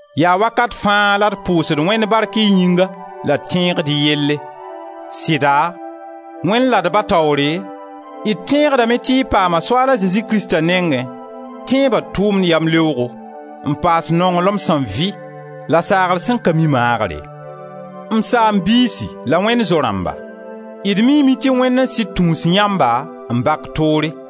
Yaa wakat fãa la d pʋʋsd Wẽnd bark y yĩnga la d tẽegd y yelle. Sɩda, Wẽnd la d Ba taoore, d tẽegdame tɩ y paama Soaal a Zezi Krista nengẽ tẽeba tʋʋmd yamleoogo, n paas nonglem sẽn vɩ, la saagr sẽn ka mi maagre. M saam-biisi la Wẽnd zo-rãmba, d miime tɩ Wẽnd n sɩd tũus yãmba n bak toore.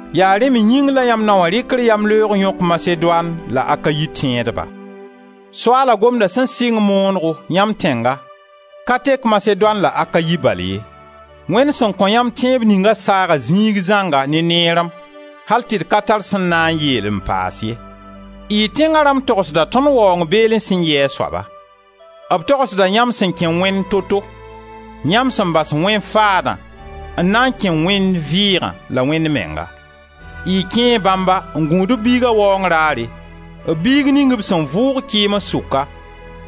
Yaa rẽ me yĩng la yãmb nao wã rɩkr yamleoog yõk Masedoan la Akayi tẽedba. Soaala Gomda sẽn sɩng moonego yãmb tẽnga ka tek Masedoan la Akayi bal ye. Wẽnd sẽn kõ yãmb tẽeb ninga saaga ziig zãnga ne neerem, al tɩ d ka tar sẽn na n yeel n paas ye. Y tẽnga rãmb togsda tõnd waoong beelẽ sẽn yɩ a soaba. B togsda yãmb sẽn kẽ Wẽnd to-to; yãmb sẽn bas wẽn faadã n na n kẽ Wẽnd vɩɩga la Wẽnd menga. Y kẽe bãmba n gũud b Biiga waoong raare, b Biig ning b sẽn vʋʋg kɩɩms sʋka,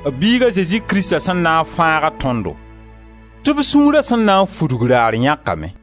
b Biig a Zezi Krista sẽn na n fãag-a tõndo, tɩ b sũura sẽn na n fudg raar yãkame.